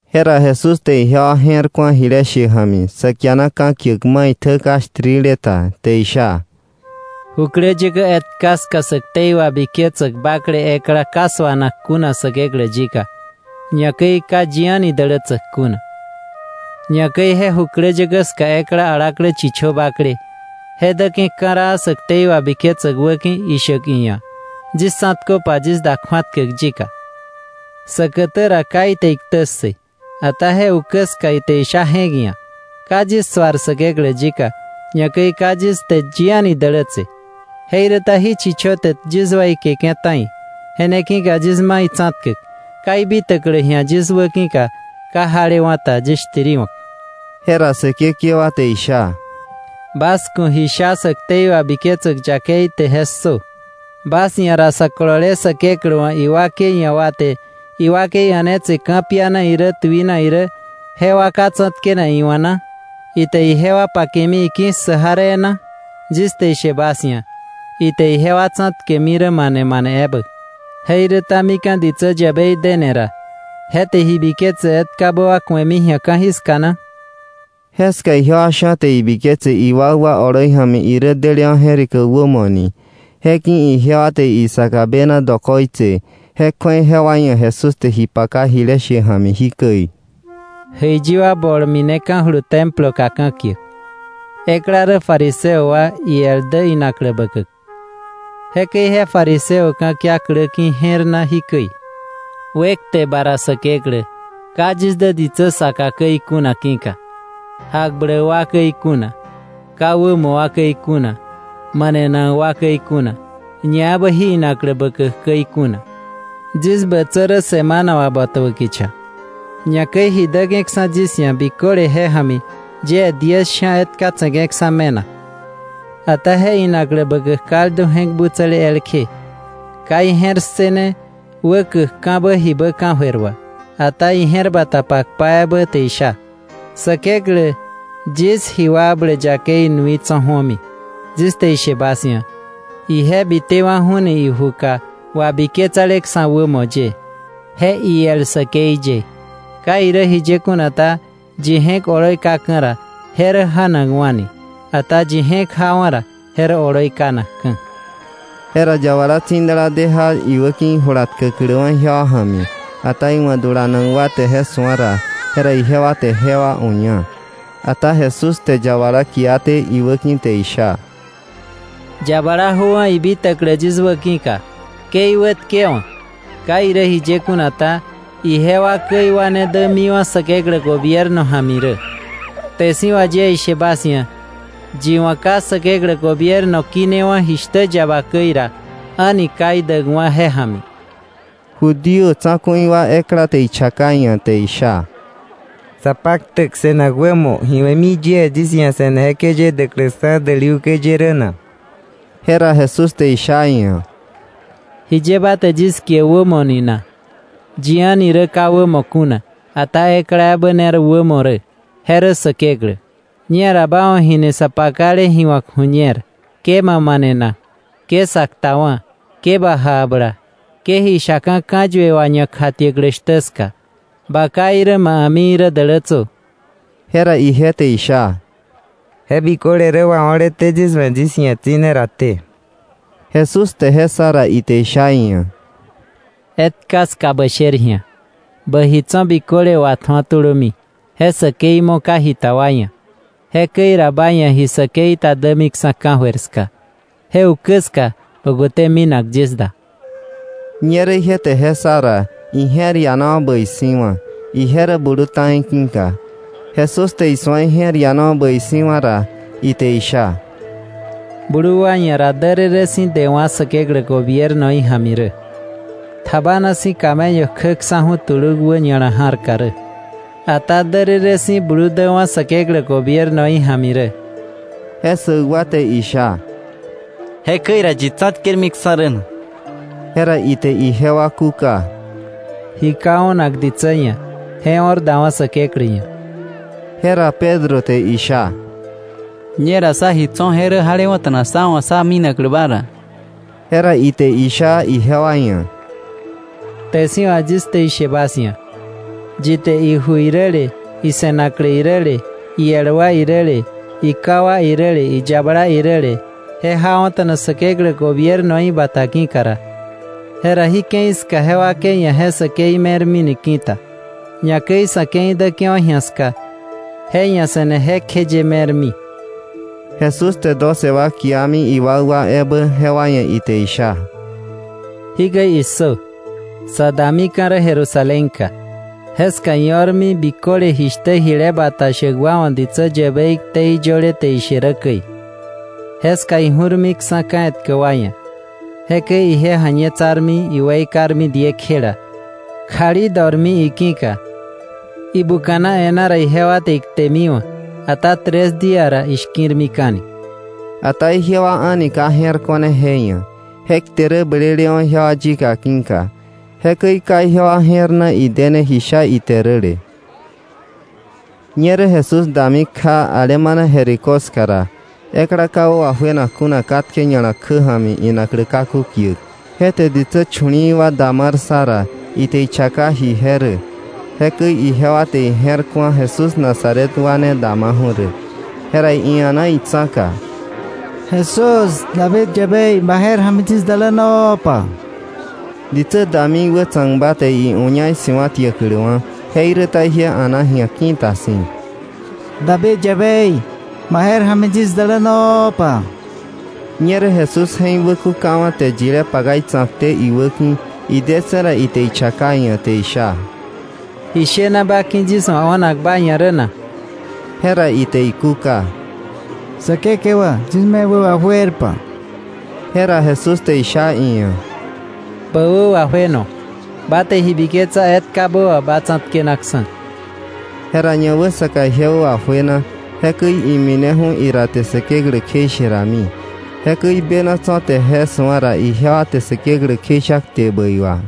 Jera Jesús te ijewa je̱r ku̱a jile she ja̱mi sa kiana ka̱kiäk maitjä ka shtirile ta, te isha: “Jukläyäkä etka ska sä ktei wabiketsäk bakle ekla ka suanak kuna Säkeklä yika, ñakäi ka yi a̱ni dälätsäk kuna. Ñakäi je jukläyäkä ska ekla alaklä chichö bakle, je däke̱ ka̱raa sä ktei wabiketsäk wäki̱ ishäk iia̱: ‘Yis tsa̱tköpa yis da kju̱atkäk yika.’ Säkätä ra ka ite iktä ssë, ata je ukä ska ite isha je̱k ia̱: ‘Ka yis suar Säkeklä yika, ñakäi ka yis te yi a̱ni dälätse, jeiräta jí chichö te yis weikeke̱ ta̱i. Je ne ki̱ka yis ma itsa̱tkäk ka ibitäklä ji̱a yis wäki̱ka ka jalewa̱ ta, yis shtiriwa̱k.’” Jera Säkekewa te isha: “Bas ku̱ ji sha sä ktei wabiketsäk yakei te je ssö. ¿Bas ia̱ ra, sä kolole Säkeklä wa̱ iwakei ia̱ wa te iwakei a̱netse ka̱piana irä tuina irä jewa ka tsa̱tkenak iwa̱ na? ¿Ite ijewa pakemi iki̱ssäk jaree na? Yis te ishe bas ia̱, ite ijewa tsa̱tkemi rä mane manebä. Jeiräta mika̱ ditsä yäbei dene ra, ¿je te ji biketsäk etkabä wa ku̱emi ji̱a ka̱jiska na?” Jeska ijewa sha̱ te ibiketse iwakwa oloi ja̱mi irä delewa̱ je̱rikäk wämo ni, je ki̱ ijewa te isaka bena dokoitse, je kju̱ei jewa ia̱ Jesús te ji paka jile she ja̱mi jikäi: “Jäiyi wa bol mineka̱julu Temploka ka̱kiäk. Ekla rä fariseo wa, iel dä inaklä bäkäk. Jekäi je fariseo wa ka̱kia klä ki̱ je̱r na jikäi: ‘Wekte ba ra Säkeklä, ka yis dä ditsä saka käi kuna ki̱ka: jakbläk wa käi kuna, ka wämo wa käi kuna, manenak wa käi kuna, ñaebä jí inaklä bäkäk käi kuna. Yis bätsä rä semana wà botäbä kicha, ñakäi ji däke̱ksa̱ yis ia̱ biköle je ja̱mi yie diez sha̱ etka tse̱ke̱ksa̱ me̱nak.’ Ata je inaklä bäkäk kaldu je̱k butsäle elkje, ka ije̱r ssëne wä käkka̱bä jibä ka̱jöir wà, ata ije̱r bata pakpa ebä te isha: ‘Säkeklä, yis ji wakbläk yakei nui tso̱ ju̱omi.’ Yis te ishe bas ia̱, ije bitewa̱ju̱ni ijuka wabiketsaleksa̱ wämo ye, je iel säkei ye. Ka irä jiye kuna ta, yi je̱k oloi kaka̱ ra, je rä ja̱nakwa̱ni; ata yi je̱k jawa̱ ra, je rä oloi kanakka̱.’ Jera yabala tsi̱dala de ja iwäki̱ ijula tkäkläwa̱ ijewa ja̱mi, ata iwa̱ dulanak wa te je su̱a ra, jera ijewa te jewa uña. Ata Jesús te yabala kiaté iwäki̱ te isha: —Yabala jöwa̱, ibitäklä yis wäki̱ka, ke iwätkewa̱. Ka irä jiye kuna ta, ijewa käi wa ne dämiwa̱ Säkeklä gobierno ja̱mi rä. Kte si̱ wà yie ishe bas ia̱, yi wa̱ ka Säkeklä gobierno kinewa̱ jishtä yaba käi ra, a̱ni ka idäkwa̱ je ja̱mi. Judío tsa̱ku̱i wa ekla te ichaka iia̱ te isha: —Sapaktäk se̱nak wämo, ¿ji we̱mi yie yis ia̱ se̱ne jekjeye däkläksa̱ däli ukä ye rä na? Jera Jesús te isha iia̱: —¿Jiye ba te yis kie wämo ni na? Yi a̱ni rä ka wämo kuna, ata ekla ebä ne rä wämo rä, je rä Säkeklä. Ñera ba wa̱ jini sa pakale ji wa̱k ju̱ñer: ‘Ke ma manena. Ke sa ktawa̱. Ke ba jakbla. Ke ji shaka̱ ka̱yue wà ñakjatiäklä shtä ska. Ba ká irä ma a̱mi irä dälätsö.’ Jera ije te isha: —Je biköle rä wao̱leté yis wa̱, yis ji̱a tsi̱ne raté. Jesús te je ssa ra, ite isha iia̱: —Etka ska bä sher ji̱a, bä ji tso̱ biköle watju̱o tulömi, je säkei mo̱ ka jita wa ia̱, jekäi ra ba ia̱ ji säkei ta dämiksa̱ ka̱jöir ska. Je ukä ska bä kute minak yis da. Ñerä ije te je ssa ra, ije̱r ianawa̱ bäi si̱wa̱, ije rä blu ta̱i ki̱ka. Jesús te isu̱a ije̱r ianawa̱ bäi si̱wa̱ ra, ite isha: —Blu wa ia̱ ra därërë si̱ dewa̱ Säkeklä gobiernoí ja̱mi rä. Tjabana si̱ camello kjäksa̱ju̱ tuluk wä ña̱la ja̱rka rä, ata därërë si̱ blu däwa̱ Säkeklä gobiernoí ja̱mi rä. Je ssäk wa te isha: —Jekäi ra, ¿yi tsa̱tkermiksa̱ rä na? Jera ite ijewa kúka: —Ji ka o̱nak ditsä ia̱, je o̱r dawa̱ Säkeklä ia̱. Jera Pedro te isha: —Ñera, sá ji tso̱, je rä jalewa̱ta̱na sá wa̱ sá minaklä ba ra. Jera ite isha ijewa ia̱: —Kte si̱ wà yis te ishe bas ia̱, yi te iju iräle, ise̱naklä iräle, iel wa iräle, iká wa iräle, iyabala iräle, je jawa̱ta̱na Säkeklä gobiernoí bata ki̱ka ra, jera jí ke̱i ska je wakei ia̱ je säkei me̱rmini ki̱ta, ñakäi sa̱ ke̱i däke̱wa̱ ji̱a ska, je ia̱ se̱ne jekjeye me̱rmi. Jesús te doce wa kiami iwakwa ebä, jewa ia̱ ite isha: —¡Jikäi issö! Sa damika̱ rä Jerusalén ka. Jeska io̱rmi biköle jishtä jile bata shäk wa wa̱ ditsä yäbei ktei yöle te ishe rä käi. Jeska iju̱rmiksa̱ ka̱ etkä wa ia̱. Jekäi ije ja̱ñetsarmi, iweikarmi diekjela, kjali tjurmi iki̱ka. Ibuka̱na e̱ná ra ijewa te iktemiwa̱. Ata tres día ra ishki̱rmika̱ni.’ Ata ijewa a̱ni ka je̱r ko̱ne je ia̱, je kte rä blelewa̱ ijewa yika ki̱ka. Jekäi ka ijewa je̱r na idene ji sha ite räle. Ñerä Jesús dami kja alemana Jericó ska ra, ekla ka wä wajuenak kuna katke ña̱la kjä ja̱mi inaklä kaku kiäk, je te ditsä chu̱li̱i̱ wa damar ssa ra, ite ichaka ji je rä. Jekäi ijewa te ije̱r ku̱a Jesús Nazaret wa ne damaju̱ rä. Jera ia̱na itsa̱ka: —¡Jesús, David yäbei, ma je̱r ja̱mi yis dälänopa! Ditsä dami iwätsa̱kba te iuña isi̱wa̱tiäkläwa̱, jeiräta ije a̱na ji̱a ki̱ta si̱: —¡David yäbei, ma je̱r ja̱mi yis dälänopa! Ñerä Jesús je̱k wäkukawa̱ te yilé paka itsa̱kté iwäki̱. Idetse̱ ra, ite ichaka iia̱ te isha: —¿Ji shena ba ki̱ yis wa̱ o̱nak ba ia̱ rä na? Jera ite ikúka: —Säkekewa, yis me wä wajuerpa. Jera Jesús te isha iia̱: —Bä wä wajueno. Ba te ji biketsa etkabä wà ba tsa̱tkenaksa̱. Jera ñawäsaka ije wä wajuena, jekäi imineju̱ ira te Säkeklä kjeishe rami. Jekäi bena tso̱ te je su̱a ra, ijewa te Säkeklä kjeisha kte bäi wà.